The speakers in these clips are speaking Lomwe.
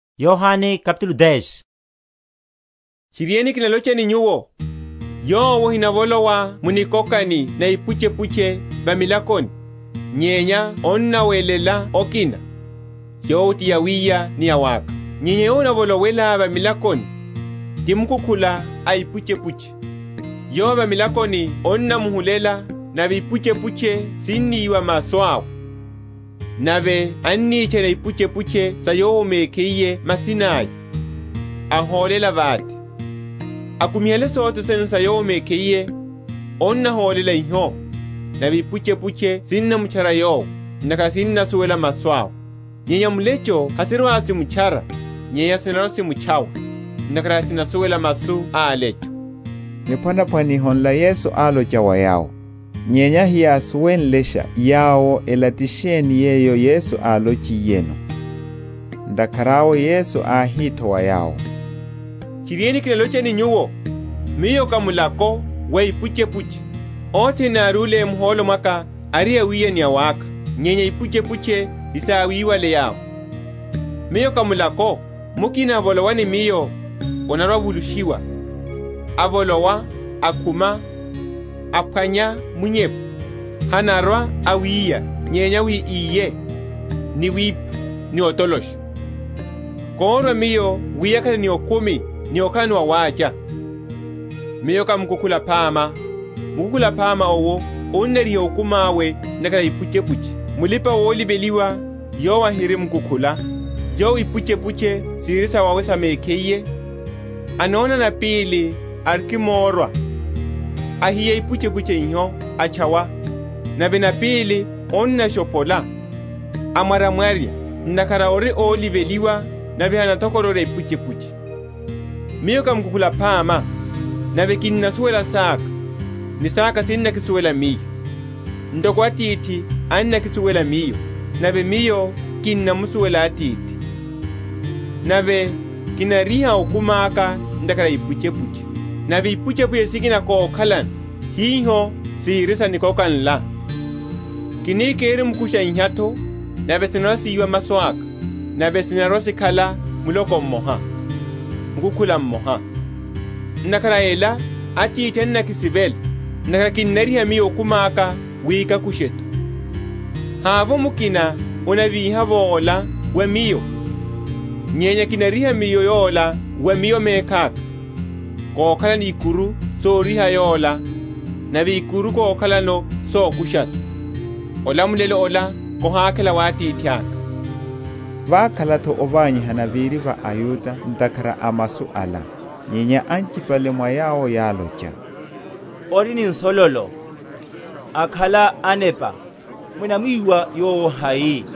Niphwanaphwaniho na Mukukhula aphama. Tchiriene, kinalocha ni nyuwo, Yowo ahinavolowa mu nikokani na ipuchepuche va milakoni, nyenya annawelela okina, yowo ti awiya ni awakha. Nyenya yowo anavolowela va milakoni, ti mukukhula a ipuchepuche. Yowo, avamilakoni annamuhulela, nave ipuchepuche siniwa masu awe; nave anitchana ipuchepuche sa yowo mekhiye masina’ya, ahólela vate. Akumihale sothene sa yowo mekhiye, anahólela iho; nave ipuchepuche sinamtchara yowo; ntakhara sinnasuwela masu awe. Nyenya mulecho hasirwa‐simutchara, nyenya sinarwa‐simutchawa: ntakhara hasinasuwela masu a alecho. Niphwanaphwaniho nla Yesu álocha wa yawo: nyenya heyásuwenlesha yawo ela ti sheni yeyo Yesu álochiyeno. Ntakhara awe Yesu áhi’tho wa yawo, Tchiriene, kinalocha ni nyuwo, Miyo ká mulako wa ipuchepuche. Othene yárúle muhólo mwaka ari awiya, ni awakha: nyenya ipuchepuche hesáwiwale yawo. Miyo ká mulako: mukina avolowa ni Miyo, anarwa‐avulushiwa, avolowa, akhuma, aphwanya munyepu. Hanarwa awiya, nyenya wi íye, ni wipha, ni otolosha. Kórwa Miyo wi yakhale ni okumi, ni okhalano wawacha. Miyo ká Mukukhula aphama: mukukhula aphama owo anariha okumi awe ntakhara a ipuchepuche. Mulipa‐oliveliwa yowo ahiri mukukhula, yowo ipuchepuche sihiri sawawe sa mekhiye, anona napili arikimorwa, ahiya ipuchepuche iho, atchawa; nave napíli anashophola, amwaryamwarya: ntakhara ori óliveliwa, nave hanathokororya ipuchepuche. Miyo ká mukukhula aphama: nave kinnasuwelasha saka, ni saka sinnakisuwelasha Miyo, ntoko Atithi annakisuwela Miyo, nave Miyo kinnamusuwela Atithi; nave kinariha okumi aka ntakhara a ipuchepuche. Nave ipuchepuche sikina kokhalano, hiho sihiri sa nikoka nla: kini kirimkusha iha’tho, nave sinarwa‐siwa masu aka; nave sinarwa‐sikhala muloko mmoha, mukukhula mmoha. Ntakhara a ela Atithi annakisivela, ntakhara kinnariha Miyo okumi aka, wi kakushe’tho. Havovo mukina anavíha’vo ola wa Miyo, nyenya kinariha Miyo yola wa Miyo mekhaka. Kokhalano ikuru soriha yola, nave ikuru kokhalano sokusha’tho; olamulelo ola kihakhela wa Atithaka. Vákhala’tho ovanyihana véri va aYuda ntakhara a masu ala. Nyenya anchipale mwa yawo yálocha, Ori ni nsololo, akhala anepa; munamwiwa Yowo hai?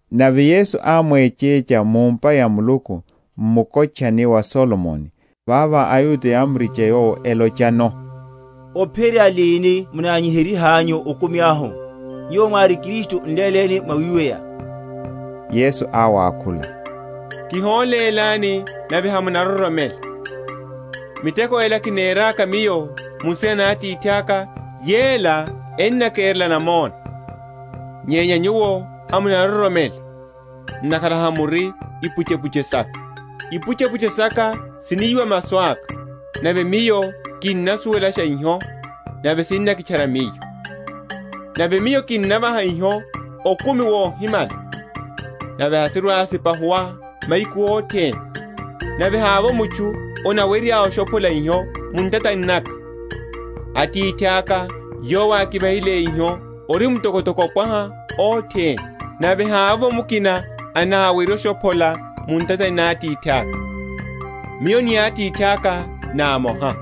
Nave Yesu ámwechecha mu’mpa ya Muluku, m’mukotchani wa Solomoni. Vavo aYuda yámuricha Yowo, elochano, Ophiyerya lini munanyiheryihanyu okumi ahu? Nyuwo mwári Kristu, n’léleni mwawiweya. Yesu áwakhula, Kiholélani, nave hamunaroromela. Miteko ela kineraka Miyo mu nsina na Atithaka, yela ennakerela namona. Nyenya nyuwo hamunaroromela, ntakhara hamuri a ipuchepuche saka. Ipuchepuche saka siniwa masu aka, nave Miyo kinnasuwelasha iho, nave sinnakitchara Miyo. Nave Miyo kinnavaha iho okumi wohimala; nave hasirwa‐sipahuwa mahiku othene, nave havovo mutchu anarwa‐ashophola iho mu ntatani naka. Atithaka, yowo ákivahile iho, ori mtokotoko ópwaha othene; nave havovo mukina anawerye oshophola mu ntatani na Atithaka. Miyo ni Atithi ná amoha.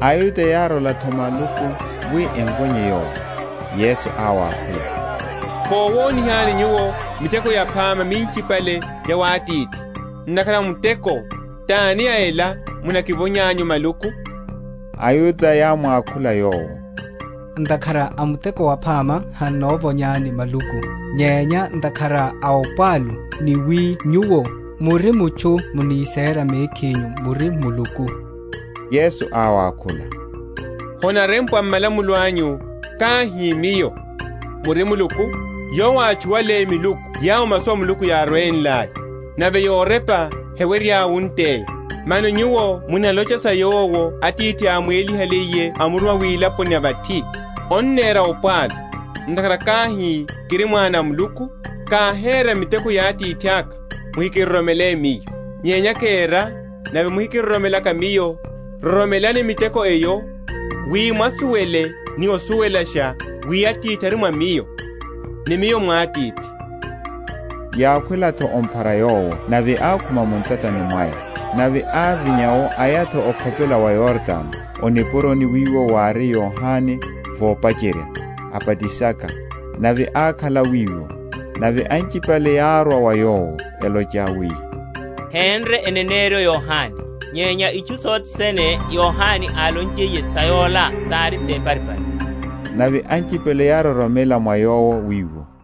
AYuda yárola’tho maluku wi emvonye Yowo. Yesu áwakhula, Kowonihani nyuwo miteko yaphama minchipale ya wa Atithi; ntakhara a muteko tani ya ela munakivonyanyu maluku? AYuda yámwakhula Yowo, Ntakhara a muteko waphama han’novonyani maluku, nyenya ntakhara a opwalu; ni wi Nyuwo, muri mutchu, munisera mekhinyu muri Muluku. Yesu áwakhula, Honarempwa m’malamulo anyu, Káhi Miyo, muri miluku? Yowo átchuwale miluku yawo masu a Muluku yárwenlaya (nave yorepa hewerya wunteya), mano nyuwo munalocha sa Yowo Atithi ámwélihaliye amuruma wilaponi ya vathi, Onnera opwalu; ntakhara káhi, Kiri Mwana a Muluku? Káhera miteko ya Atithaka, muhikiroromele Miyo. Nyenya kéra, nave muhikiroromelaka Miyo, roromelani miteko eyo; wi mwasuwele ni osuwelasha wi Atithi ari mwa Miyo, ni Miyo mwa Atithi. Yákhwela’tho omphara Yowo: nave ákhuma mu ntatani mwaya. Nave ávinya’wo aya’tho okhopela wa Yordano, o nipuroni wiwo wári Yohane vopacherya, abatisaka; nave ákhala wiwo. Nave anchipale yárwa wa Yowo; elocha wi, Hénre eneneryo Yohane; nyenya itchu sothe sene Yohane álonchiye sa yola sári séparipari. Nave anchipale yároromela mwa Yowo wiwo.